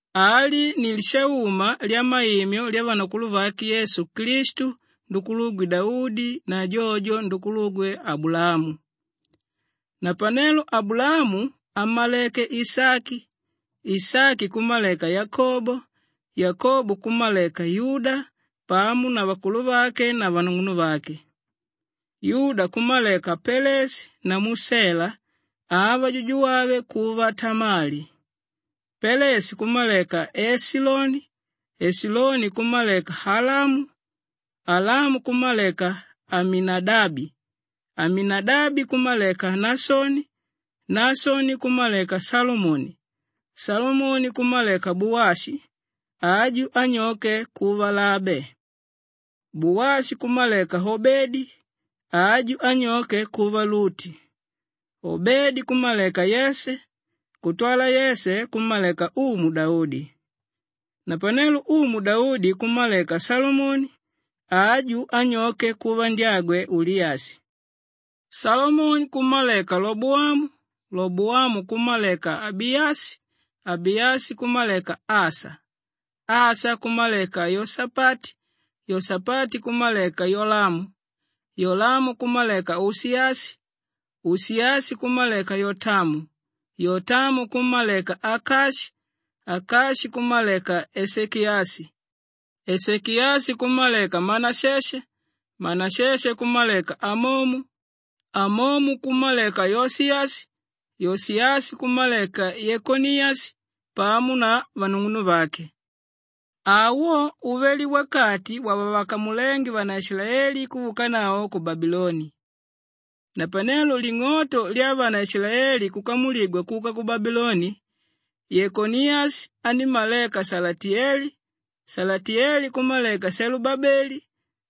Ali ni lishauma lyamaimyo lyavanakuluvake Yesu Klistu ndukulugwe Daudi na jojo ndukulugwe Abulaamu. Napanelo Abulaamu ammaleké Ishaki, Ishaki kummaleka Yakobo, Yakobo kummaleka Yuda pamo na vakuluvake na vanung'unuvake. Yuda kummaleka Peleshi namu Shelaa, ava, jujugwave kuva Tamali. Peleshi kummaleka Eshiloni, Eshiloni kummaleka Alamu, Alamu kummaleka Aminadabi, Aminadabi kummaleka Naashoni, Naashoni kummaleka Shalamoni, Shalamoni kummaleka Buwashi, aju, anyoke kuva Laabe. Buwashi kummaleka Obedi, aju, anyoke kuva Luti. Obedi kummaleka Yeshe, kutwala Yeshe kummaleka Umu Daudi. Napanelo Umu Daudi kummaleka Shalomoni, aju, anyoke kuva ndyagwe Uliyashi. Shalomoni kummaleka Loboamu, Loboamu kummaleka Abiyashi, Abiyashi kummaleka Asha, Asha kummaleka Yoshapati, Yoshapati kummaleka Yolamu, Yolamu kummaleka Ushiyashi, Ushiyashi kummaleka Yotamu, Yotamu kummaleka Akashi, Akashi kummaleka Eshekiyashi, Eshekiyashi kummaleka Manasheshe, Manasheshe kummaleka Amomu, Amomu kummaleka Yoshiyashi, Yoshiyashi kummaleka Yekoniyashi pamo na vanung'unuvake. Awo uvele wakati wavavakamulénge vanaishilaeli kuvaukanavo ku Babiloni. Napanelo ling'oto lyavanaishilaeli kukamuligwa kuka ku Babiloni, Yekoniyashi anímmaleka Shalatiyeli, Shalatiyeli kummaleka Shelubabeli,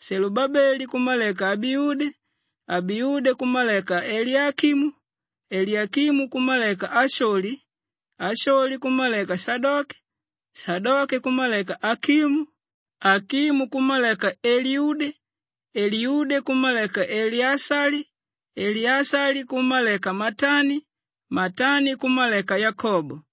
Shelubabeli kummaleka Abiude, Abiude kummaleka Eliyakimu, Eliyakimu kummaleka Asholi, Asholi kummaleka Shadoke, Shadoke kummaleka Akimu, Akimu kummaleka Eliyude, Eliyude kummaleka Eleashali, Eleashali kummaleka Matani, Matani kummaleka Yakobo,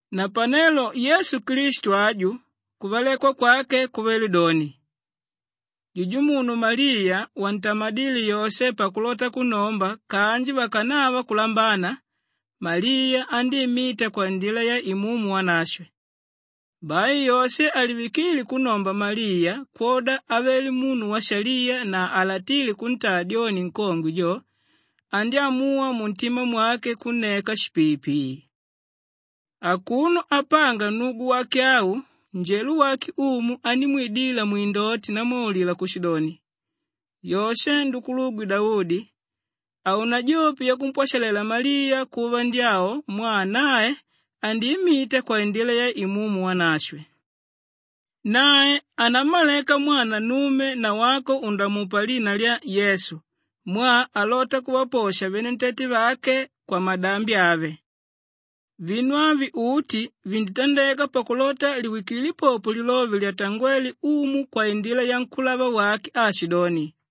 Napanelo Yesu Klistu aju, kuvalekwa kwake kuvele doni. Jujumunu Maliya wantamadíle Yoshe pakulota kunnomba kanji vakanava kulambana, Maliya andíimita kwaindila ya Imumu Wanashwe. Bai Yoshe alivikíle kunnomba Maliya kwoda avele munu waishaliya na halatíle kuntaa dyoni nkongwe jo, andyámuwa muntima mwake kunneka shipiipii. Akuno apanga nnugu wake au, njelo wake Umu andímwidila mwindoti ndamwaulila kushidoni, “Yoshe ndukulugwe Daudi, haunajope yakumpwashalela Maliya kuva ndyavo mwaa nae andiimita kwaindila ya Imumu Wanashwe. Nae anammaleka mwana nnume na wako undamupa lina lya Yesu mwaa alota kuvaposha venentete vake kwamadambi ave.” Vinu avi uti vinditandeka pakulota liwikile popo lilove lyatangwéle Umu kwaindila yankúlava wake aashidoni,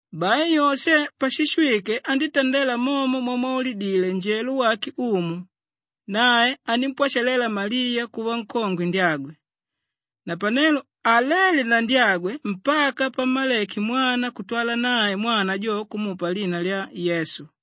Bai Yoshe pashishwike andítandela momo mwamwaulidile njelo wake Umu, nae anímpwashalela Maliya kuva nkongwe ndyagwe. Napanelo haléle na ndyagwe mpaka pammaleke mwana kutwala nae mwana jo kumupa lina lya Yesu.